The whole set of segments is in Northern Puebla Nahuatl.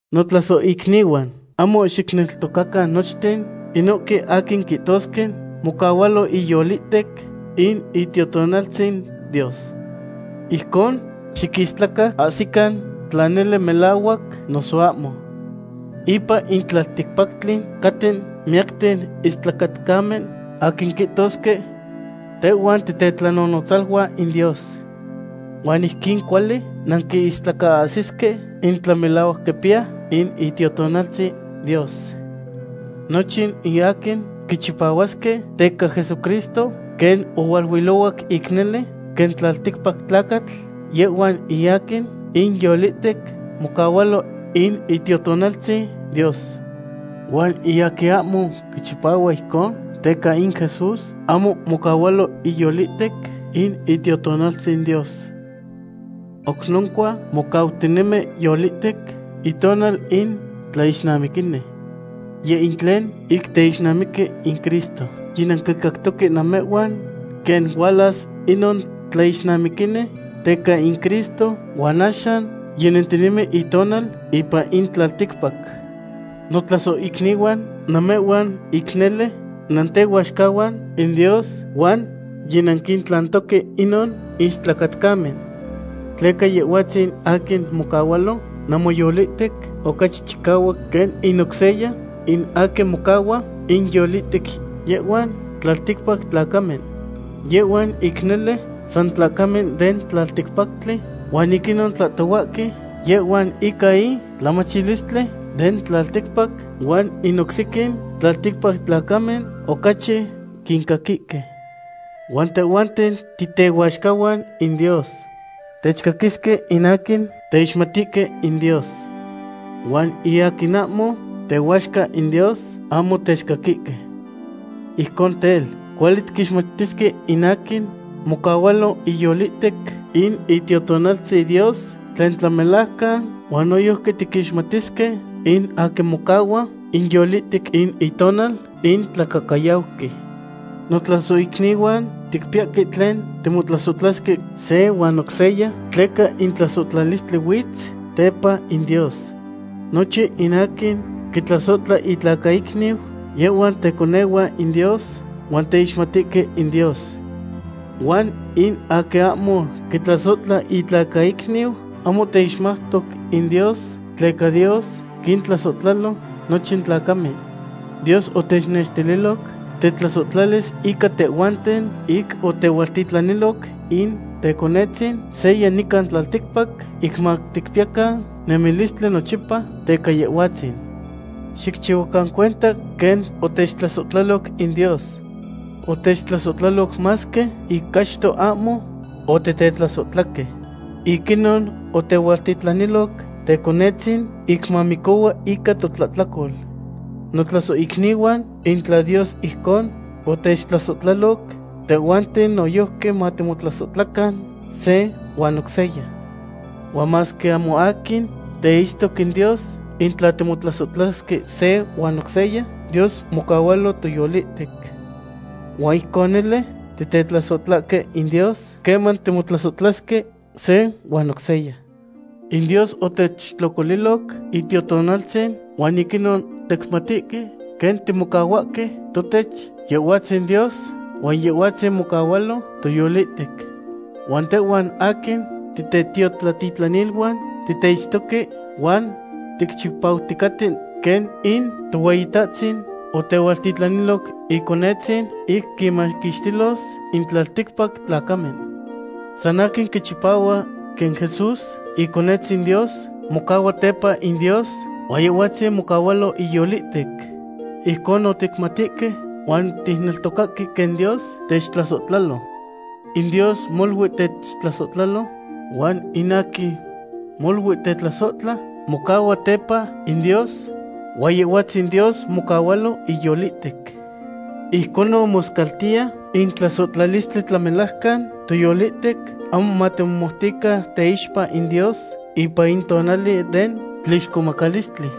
Notlasohicnihuan, ahmo xicneltocacan nochten inohque aquin quihtosque mocahualo inyolihtec in Itiotonaltzin Dios. Ijcon xiquistlacaahsican tla nele melahuac noso ahmo. Ipan in tlalticpactli caten miyacten istlacatcamen aquin quihtosque: “Tehhuan titetlanonotzaluan in Dios.” Huan ijquin cuali nanquistlacaahsisque in tla melahuac quipiya in Itiotonaltzin Dios. Nochin in aquin quichipahuasque teca Jesucristo quen ohualuilohuac ic nele quen tlalticpac tlacatl, yehhuan in aquin inyolihtec mocahualo in Itiotonaltzin Dios. Huan in aquin ahmo quichipahua ijcon teca in Jesús, ahmo mocahualo iyolihtec in Itiotonaltzin Dios. Oc noncua mocautinemi yolihtec itonal in tlaixnamiquini. Yeh in tlen ic teixnamiqui in Cristo. Yinanquicactoque namehhuan quen hualas inon tlaixnamiquini teca in Cristo, huan axan yinentinemi itonal ipan in tlalticpac. Notlasohicnihuan, namehhuan ic nele nantehuaxcahuan in Dios, huan yinanquintlantoque inon istlacatcamen. Tleca Yehhuatzin aquin mocahualo namoyolihtec ocachi chicahuac quen in oc seya in aquin mocahua inyolihtec yehhuan tlalticpac tlacamen. Yehhuan ic nele san tlacamen den tlalticpactli, huan ic inon tlahtohuahque yehhuan ica in tlamachilistli den tlalticpac, huan in oc sequin tlalticpac tlacamen ocachi quincaquihque. Huan tehhuanten titehuaxcahuan in Dios. Techcaquisque in aquin teixmatihque in Dios. Huan in aquin ahmo tehuaxca in Dios ahmo techcaquihque. Ijcon tel, cuali tiquixmatisque in aquin mocahualo inyolihtec in Itiotonaltzin Dios tlen tlamelajcan, huan noyojqui tiquixmatisque in aquin mocahua inyolihtec in itonal in tlacahcayauqui. Notlasohicnihuan, ticpiyahque tlen timotlasohtlasque se huan oc seya, tleca in tlasohtlalistli huitz tepa in Dios. Nochin in aquin quitlasohtlahque itlacaicniu yehhuan teconehuan in Dios huan teixmatihque in Dios. Huan in aquin ahmo quitlasohtla itlacaicniu ahmo teixmautoc in Dios, tleca Dios quintlasohtlalo nochin tlacamen. Dios otechnextililoc tetlasohtlalis ica tehhuanten, ic otehualtitlaniloc in Teconetzin seya nican tlalticpac ic maticpiyacan nemilistli nochipa teca Yehhuatzin. Xicchihuacan cuenta quen otechtlasohtlaloc in Dios. Otechtlasohtlaloc masque ic achto ahmo otitetlasohtlahque. Ic inon otehualtitlaniloc Teconetzin ic mamicohua ica totlahtlacol. Notlasohicnihuan, in tla Dios ijcon otechtlasohtlaloc, tehhuanten noyojqui matimotlasohtlacan se huan oc seya. Huan masque ahmo aquin teitztoc in Dios, in tla timotlasohtlasque se huan oc seya, Dios mocahualo toyolihtec. Huan ijcon nele titetlasohtlahque in Dios queman timotlasohtlasque se huan oc seya. In Dios otechtlocoliloc Itiotonaltzin huan ic inon ticmatihque quen timocahuahque totech Yehhuatzin Dios huan Yehhuatzin mocahualo toyolihtec. Huan tehhuan aquin titetiotlatitlaniluan titeitztoque huan ticchipauticaten quen in Tohueyitahtzin otehualtitlaniloc Iconetzin ic quinmaquixtilos in tlalticpac tlacamen. San aquin quichipahua quen Jesús Iconetzin Dios mocahua tepa in Dios huan Yehhuatzin mocahualo iyolihtec. Ijconon ticmatihque huan ticneltocahque quen Dios techtlasohtlalo. In Dios molui techtlasohtlalo huan in aquin molui tetlasohtla mocahua tepa in Dios, huan Yehhuatzin Dios mocahualo iyolihtec. Ijconon moscaltiya in tlasohtlalistli tlamelajcan toyolihtec, ahmo matimomoutican teixpa in Dios ipan in tonali den tlixcomacalistli.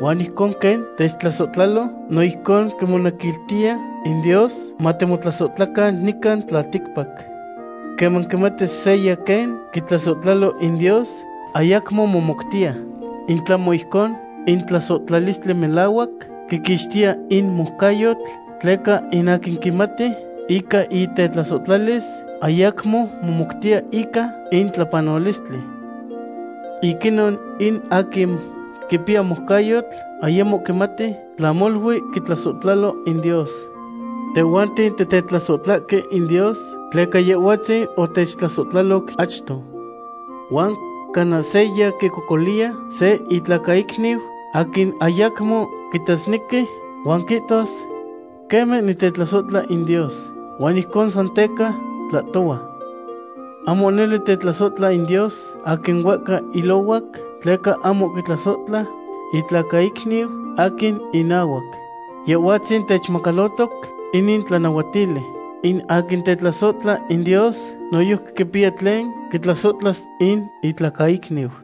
Huan ijcon quen techtlasohtlalo, no ijcon quimonequiltiya in Dios matimotlasohtlacan nican tlalticpac. Queman quimati seya quen quitlasohtlalo in Dios, ayacmo momoutiya. In tlahmo ijcon, in tlasohtlalistli melahuac quiquixtiya in moucayotl, tleca in aquin quimati ica tetlasohtlalis ayacmo momoutiya ica in tlapanolistli. Ic inon in aquin quipiya moucayotl ayamo quimati tla molui quitlasohtlalo in Dios. Tehhuanten titetlasohtlahque in Dios tleca Yehhuatzin otechtlasohtlaloc achto. Huan cana seya quicocoliya se itlacaicniu aquin ayacmo quitasnequi, huan quihtos: “Queme nitetlasohtla in Dios.” Huan ijcon san teca tlahtohua. Ahmo nele tetlasohtla in Dios aquin huehca ilohuac, tleca ahmo quitlasohtla itlacaicniu aquin inahuac. Yehhuatzin techmacalotoc inin tlanahuatili; in aquin tetlasohtla in Dios noyojqui quipiya tlen quitlasohtlas in itlacaicniu.